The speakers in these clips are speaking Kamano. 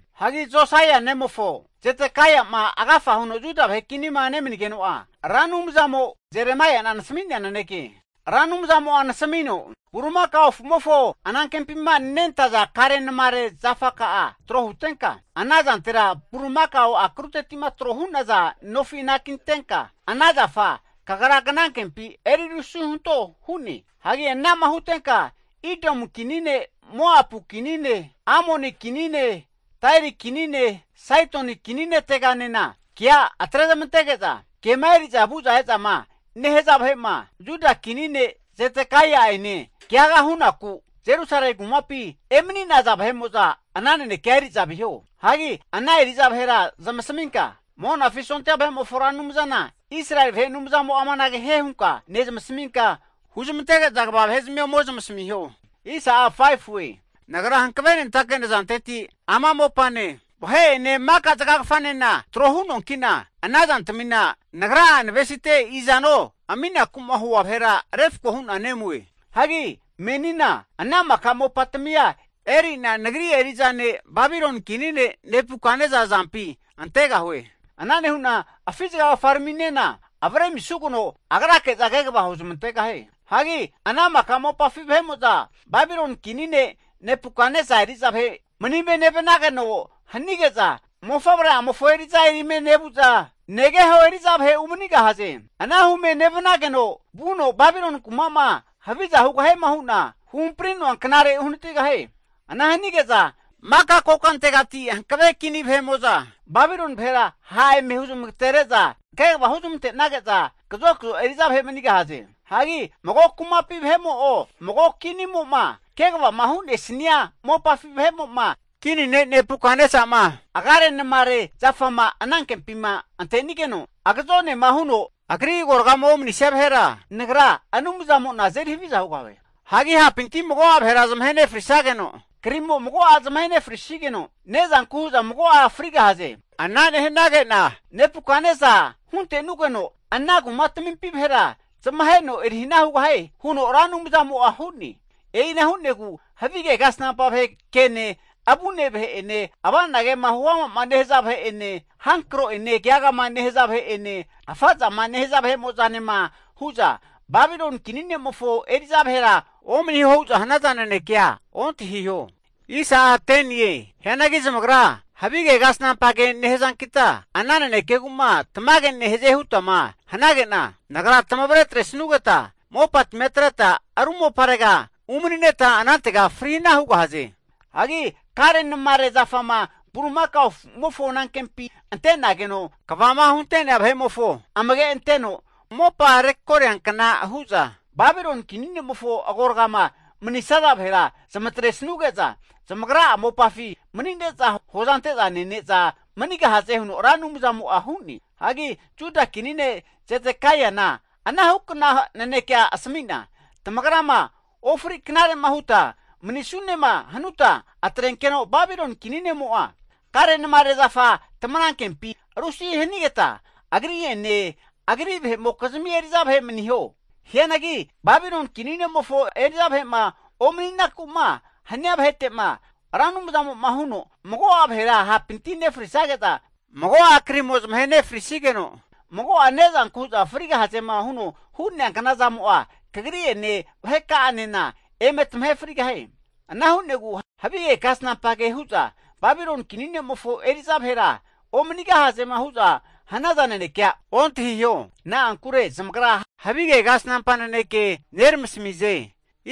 Hagi Josaia nemofo Zedekaia'ma agafa huno Juda vahe kinima nemanigeno'a, Ra Anumzamo Jeremaia'na nasami'nea naneke. Ra Anumzamo'a nasamino, Bulimakao afumofo anankempima nentaza karenamare zafaka'a tro hutenka, ana zantera bulimakao akruteti'ma tro hu'naza nofi anakitenka ana zafa kagra knankempi eri rusi hunto hu'ne. Hagi ana'ma hutenka Idomu kinine Moapu kinine Amoni kinine Tairi kinine Saidoni kini neteganena kea atrezmantege'za, kema eri'za vu'za e'zama nehaza vahe'ma, Juda kini ne' Zedekaia'ene keaga hunaku Jerusalemi kumapima emani'naza vahe'mo'za ana nanekea eri'za viho. Hagi ana eri'za vahera zamasaminka, Monafi sondia vahe'mofo Ra Anumzana Israeli vahe Anumzamo'a amanage hie hunka nezmasminka, huzmantege'za kva vahezamia ome zamasamiho. Nagra hankavenentake nazanteti ama mopane, vahe'ene maka zagagafanena tro hu'noankina, ana zantamina Nagra'a navesite izano aminaku'ma hua vahera refko hu'na nemue. Hagi menina ana maka mopatamia eri'na Nagri eri'za ne' Babiloni kini ne' Nebukatnesa azampi antegahue. Ana nehu'na afi zagagafaraminena avre amisugeno agrake'za kegava huzamantegahie. Hagi ana maka mopafi vahe'mo'za Babiloni kini ne' Nebukatnesa eri'za vahe manime nevanageno hanige'za, mofavre'amofo eri'za erime nevuza negeho eri'za vahe umanigahaze. Ana hume nevanageno vuno Babiloni kuma'ma haviza hugahiema hu'na huhampari'noa knare uhanatigahie. Ana hanige'za maka kokantegati hankave kini vahe'mo'za Babiloni vahera ha' eme huzamagatere'za kegava huzamante'nage'za kazokzo eri'za vahe manigahaze. Hagi mago kumapi vahe'mo'o mago kinimo'ma kegavama hu'nesania mopafi vahe'mo'ma kini ne' Nebukatnesa'ma agarenamare zafama anankempima antenigeno agazonema huno agri agoragama omanisia vahera, Nagra Anumzamo'na azeri haviza hugahue. Hagi hapinti mago'a vahera zamahe nefrisageno, krimo mago'a zamahe nefrisigeno, ne'zanku hu'za mago'a frigahaze. Ana nehanage'na Nebukatnesa hunte'nugeno ana kumatamimpi vahera zamaheno erihana hugahie, huno Ra Anumzamo'a hu'ne. E'ina hu'negu havige kasnampa vahe kene, avune vahe'ene, ava'na kema huama nehaza vahe'ene, hankro'ene keagama nehaza vahe'ene, afa zama nehaza vahemo'zanema hu'za, Babiloni kini ne'mofo eri'za vahera omaniho hu'za hanaza nanekea ontahiho. Hianagi zamagra havige kasnampage nehazankita ana nanekegu'ma tamage nehaze hutama hanage'na, Nagra tamavre atresanugeta mopatamia atreta ru moparega umanineta anantega fri hana hugahaze. Hagi karenamare zafama bulimakao afu'mofo anankempi ante'nageno kvama hunte'nea vahe'mofo amage anteno mopa rekoria kna hu'za, Babiloni kini ne'mofo agoragama mani'saza vahera zamatresanuge'za zamagra'a mopafi manine'za hoza ante'za nene'za manigahaze huno Ra Anumzamo'a hu'ne. Hagi Juda kini ne' Zedekaina anahukna nanekea asami'na, tamagrama ofri knare'ma huta manisunema hanuta atrenkeno Babiloni kini ne'mo'a karenamare zafa tamanankempi rusi hanigeta, agri'ene agri vahe'mokizmi eri'za vahe maniho. Hianagi Babiloni kini ne'mofo eri'za vahe'ma omani'naku'ma hania vahete'ma, Ra Anumzamo'ma huno mago'a vahera hapinti nefrisage'za, mago'a krimo zamahe nefrisigeno, mago'a ne'zanku hu'za frigahazema huno hu'nea knazamo'a kagri'ene vaheka'anena eme tamahe frigahie. Ana hunegu havige kasnampa ke huza, Babiloni kini ne'mofo eri'za vahera omanigahazema hu'za hanaza nanekea ontahiho. Na'ankure zamagra havige kasnampa naneke neramasamize.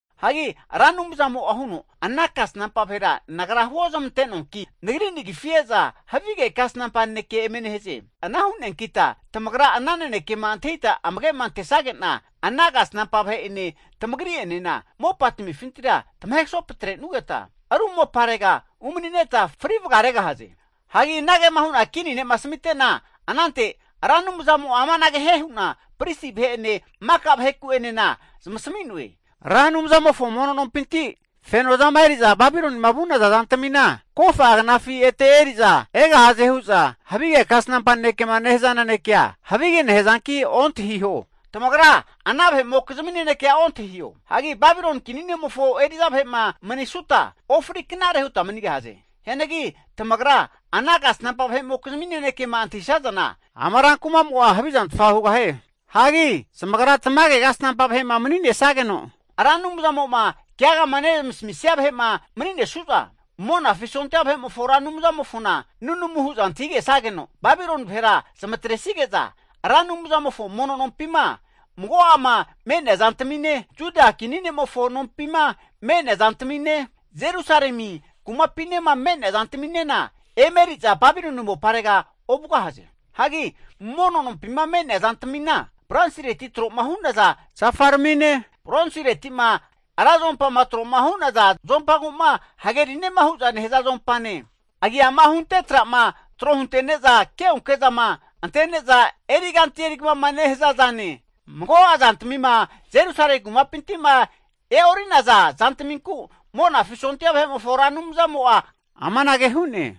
Hagi Ra Anumzamo'a huno, ana kasnampa vahera Nagra huozamante'noanki, Nagri nagifi e'za havige kasnampa naneke eme nehaze. Ana hu'neankita tamagra ana nanekema antahita amage'ma antesage'na, ana kasnampa vahe'ene tamagri'enena mopa tamifintira tamahe kasopetresanugeta ru moparega umanineta fri vagaregahaze. Hagi anagema hu'na kini ne'ma asamite'na, anante Ra Anumzamo'a amanage hie hu'na pristi vahe'ene maka vaheku'enena zamasami'noe. Ra Anumzamofo mono nompinti feno zama eri'za Babilonima vu'naza zantamina kofa'a knafi ete eri'za egahaze hu'za havige kasnampa nanekema nehaza nanekea havige nehazanki ontahiho. Tamagra ana vahe'mokizmi nanekea ontahiho. Hagi Babiloni kini ne'mofo eri'za vahe'ma manisuta, ofri knare huta manigahaze. Hianagi tamagra ana kasnampa vahe'mokizmi nanekema antahisazana, ama rankuma'mo'a havizantfa hugahie. Hagi zamagra tamage kasnampa vahe'ma mani'nesageno Ra Anumzamo'ma keagama nezmasamisia vahe'ma mani'nesu'za, Monafi sondia vahe'mofo Ra Anumzamofona nunamu hu'za antahigesageno, Babiloni vahera zamatresige'za Ra Anumzamofo mono nompima mago'ama me'nea zantamine, Juda kini ne'mofo nompima me'nea zantamine, Jerusalemi kumapinema me'nea zantaminena eme eri'za Babiloni moparera ovugahaze. Hagi mono nompima me'nea zantamina, bronsireti tro'ma hu'naza zafaramine, bronsireti'ma ra zuompama tro'ma hu'naza zuompagu'ma hagerinema hu'za nehaza zoumpane, agiama hunte tra'ma tro huntene'za keonke zama ante'neza eri kanti kamama nehaza zane, mago'a zantamima Jerusalemi kumapinti'ma e'ori'naza zantaminku, Monafi sondia vahe'mofo Ra Anumzamo'a amanage hu'ne.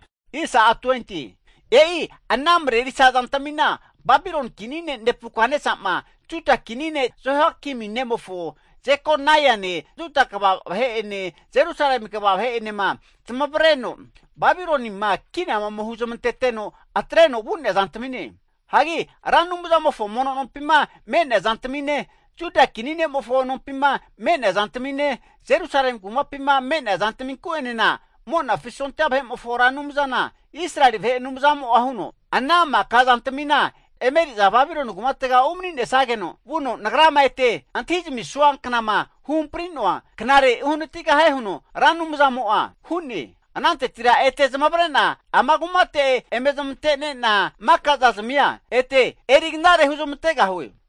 E'i ana marerisa zantamina, Babiloni kini ne' Nebukatnesa'ma Juda kini ne' Jehoiakimi nemofo Jekoniane Juda kva vahe'ene Jerusalemi kva vahe'enema zamavareno Babilonima kina ome hunezmanteno atreno vu'nea zantamine. Hagi Ra Anumzamofo mono nompima me'nea zantamine, Juda kini ne'mofo nompima me'nea zantamine, Jerusalemi kumapima me'nea zantaminku'enena, Monafi sondia vahe'mofo Ra Anumzana Israeli vahe Anumzamo'a huno, Ana maka zantamina eme eri'za Babiloni kumatega umani'nesageno vuno Nagrama ete antahi zamisua knama huhampri'noa knare uhanatigahie huno Ra Anumzamo'a hu'ne. Anantetira ete zamavare'na ama kumate eme zamante'nena makaza zamia ete eri knare huzmantegahue.